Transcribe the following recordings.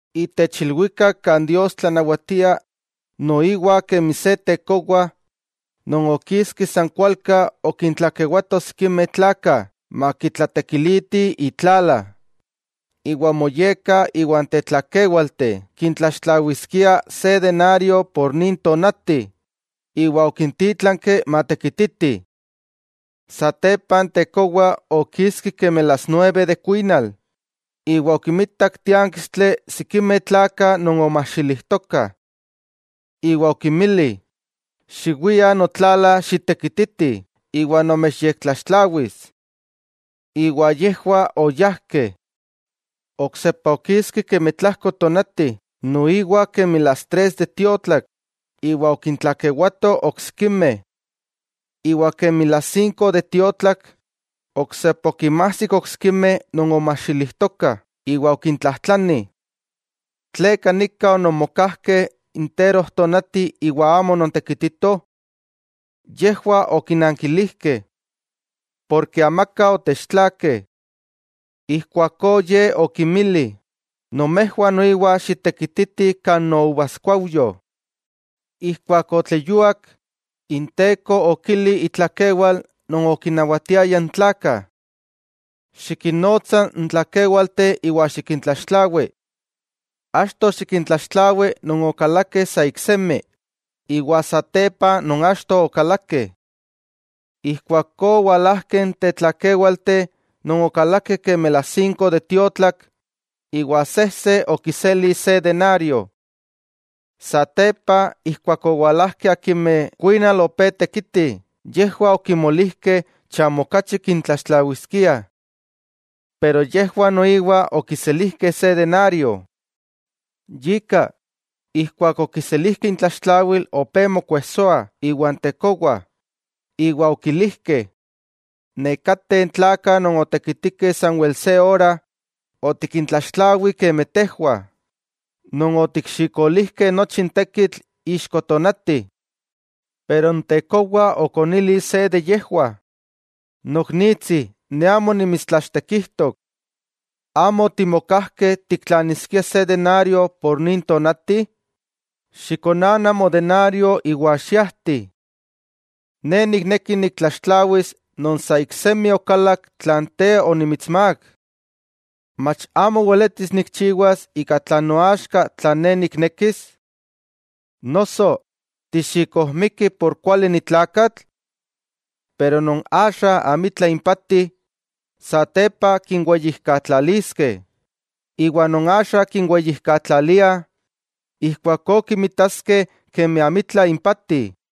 'Itech ilwikak kan Dios tlanawatia, noiwa kemi se tekowa non okiski san kualka okintlakewato sikimeh tlakah makitlatekilitih itlala. Iwa omoyekka iwan tetlakéwalteh kintlaxtlawiskia se denario itech non tonati, iwa okintítlanki matekititih. 'Satepa n tekowa okiski kemi las nueve de kuinal, iwa okinmitak tiánkistli sikimeh tlakah non omajxilijtokah. Iwa okinmili: “Xiwiah notlala xitekititih iwa nomechyektlaxtlawis.” Iwa yejwah oyájkeh. 'Oksepa okiski kemi tlajko tonati, noiwa kemi las tres de tiotlak, iwa okintlakewato oksikimeh. 'Iwa kemi las sinko de tiotlak, oksepa okinmajsik oksikimeh non omajxilijtokah, iwa okintlajtlani: “¿Tleka nika ononmokajkeh interojtonati iwa amo onontekititoh?” Yejwah okinankilijkeh: “Porke amaka otechtlakeh.” Ijkuakó ye okinmili: “Nomejwah noiwa xitekititih kan nouvaskuaujyo.” 'Ijkuak otleyuak, inteko okili itlakewal non okinnawatiaya n tlakah: “Xikinnotsa n tlakéwalteh iwa xikintlaxtlawi. Achto xikintlaxtlawi non okalakeh sa iksemi, iwa satepa non achto okalakeh.” Ijkuakó owalajkeh n tetlakéwalteh non okalakeh kemi las sinko de tiotlak, iwa sejse okiseli se denario. Satepa, ijkuak owalajkeh akimeh kuinal opé tekitih, yejwah okimolijkeh chamo okachi kintlaxtlawiskiah. Pero yejwah noiwa okiselijkeh se denario. 'Yika, ijkuak okiselijkeh intlaxtlawil opé mokuejsoah iwan tekowa, iwa okilijkeh: “Nekateh tlakah non otekitikeh sanwel se ora, otikintlaxtlawi kemi tejwah, non otikxikolijkeh nochi n tekitl ixko tonati.” Pero n tekowa okonili se de yejwah: “Noknitsi, ne amo nimitstlachtekijtok. ¿Amo otimokajkeh tiktlaniskia se denario itech nin tonati? Xikonana modenario iwa xiajti. Ne nikneki niktlaxtlawis non sa iksemi okalak tlan te onimitsmák. ¿Mach amo weletis nikchiwas ika tlan noaxka tlan ne niknekis? Noso, ¿tixikojmiki por kuali ni tlakatl?” Pero non axa amitla impati, satepa kinweyijkatlaliskeh, iwa non axa kinweyijkatlaliah, ijkuakó kinmitaskeh kemi amitla impati.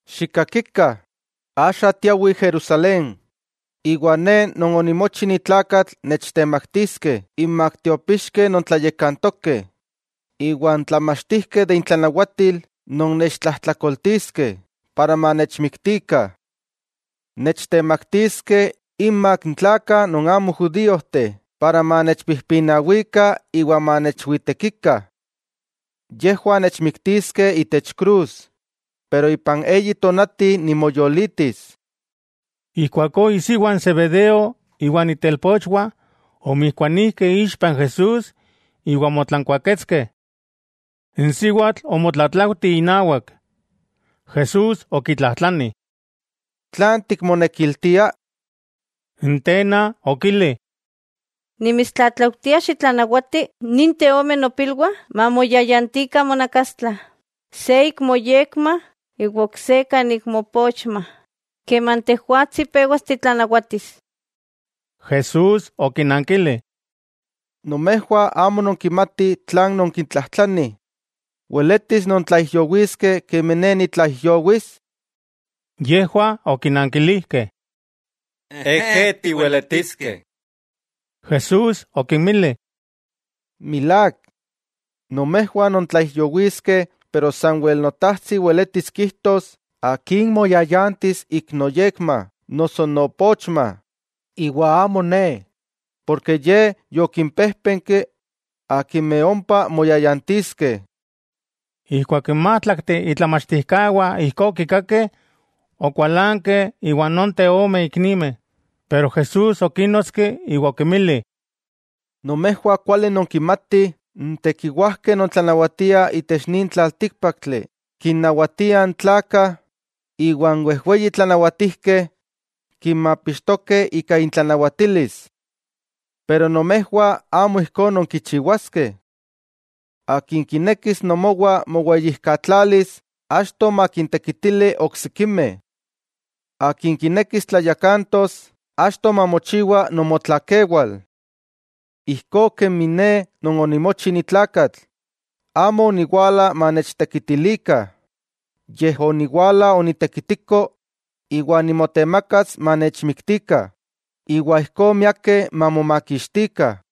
—Xikkakikah, axa tiawih Jerusalén, iwa Ne Non onimochi ni tlakatl nechtemaktiskeh inmak tiopixkeh non tlayakantokeh, iwa n tlamachtijkeh de intlanawatil non nechtlajtlakoltiskeh para manechmiktikah. Nechtemaktiskeh inmak n tlakah non amo judíojteh para manechpijpinawikah iwa manechwitekikah. Yejwah nechmiktiskeh itech krus, pero ipan eyi tonati nimoyolitis. Ijkuakó isiwa n Zebedeo iwa itelpochwah, omijkuanijkeh ixpa Jesús iwa omotlankuaketskeh. N siwatl omotlatlaujti inawak. Jesús okitlajtlani: —¿Tlan tikmonekiltia? N tena okili: —Nimitstlatlaujtia xitlanawati ninteh ome nopilwah mamoyayantikah monakastla, se ik moyekma iwa ok se kan ik moopochma, keman tejwatsi pewas titlanawatis. Jesús okinankili: —Nomejwah amo nonkimatih tlan nonkitlajtlanih. ¿Weletis nontlaijyowiskeh kemi ne nitlaijyowis? Yejwah okinankilijkeh: —Ejé, tiweletiskeh. Jesús okinmili: —Milák, nomejwah nontlaijyowiskeh, pero sanwel Notajtsi weletis kijtos akin moyayantis ik noyekma noso noopochma, iwa amo Ne. Porke Ye yokimpéjpenki akimeh ompa moyayantiskeh. Ijkuak n májtlakteh itlamachtijkawah ijkó okikakeh, okualankeh iwan nonteh ome iknimeh. Pero Jesús okínnotski iwa okinmili: —Nomejwah kuali nonkinmatih n tekiwajkeh non tlanawatiah itech nin tlaltíkpaktli, kinnawatiah n tlakah, iwa n wejweyi tlanawatijkeh kinmapixtokeh ika intlanawatilis. Pero nomejwah amo ijkó nonkichiwaskeh. Akin kinekis nomowa moweyijkatlalis, achto makintekitili oksikimeh. Akin kinekis tlayakantos, achto mamochiwa nomotlakewal. Ijkó kemi Ne Non onimochi ni tlakatl amo oniwala manechtekitilikah, yej oniwala onitekitiko iwa nimotemakas manechmiktikah iwa ijkó miakeh mamomakixtikah.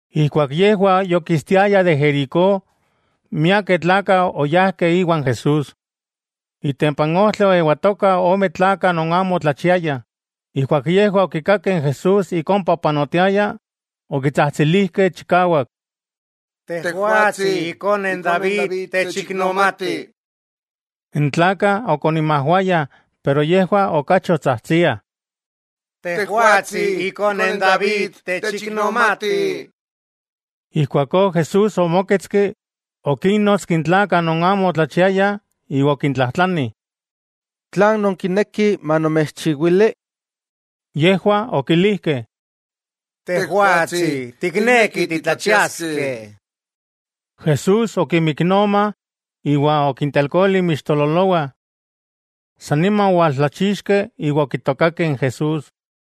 Ijkuak yejwah yokistiayah de Jericó, miakeh tlakah oyajkeh iwan Jesús. Itempa n ojtli oewatokah ome tlakah non amo otlachiayah. Ijkuak yejwah okikakeh Jesús ik ompa opanotiaya, okitsajtsilijkeh chikawak: —¡Tejwatsi, ikone n David, techiknomati! N tlakah okoninmajwayah pero yejwah okachi otsajtsiah: —¡Tejwatsi, ikone n David, techiknomati! Ijkuakó Jesús omóketski, okínnotski n tlakah non amo otlachiayah iwa okintlajtlani: —¿Tlan nonkinekih manomechchiwili? Yejwah okilijkeh: —Tejwatsi, tiknekih titlachiaskeh. Jesús okinmiknoma, iwa okintelkoli inmixtololowah. San nima owaltlachixkeh, iwa okitokakeh n Jesús.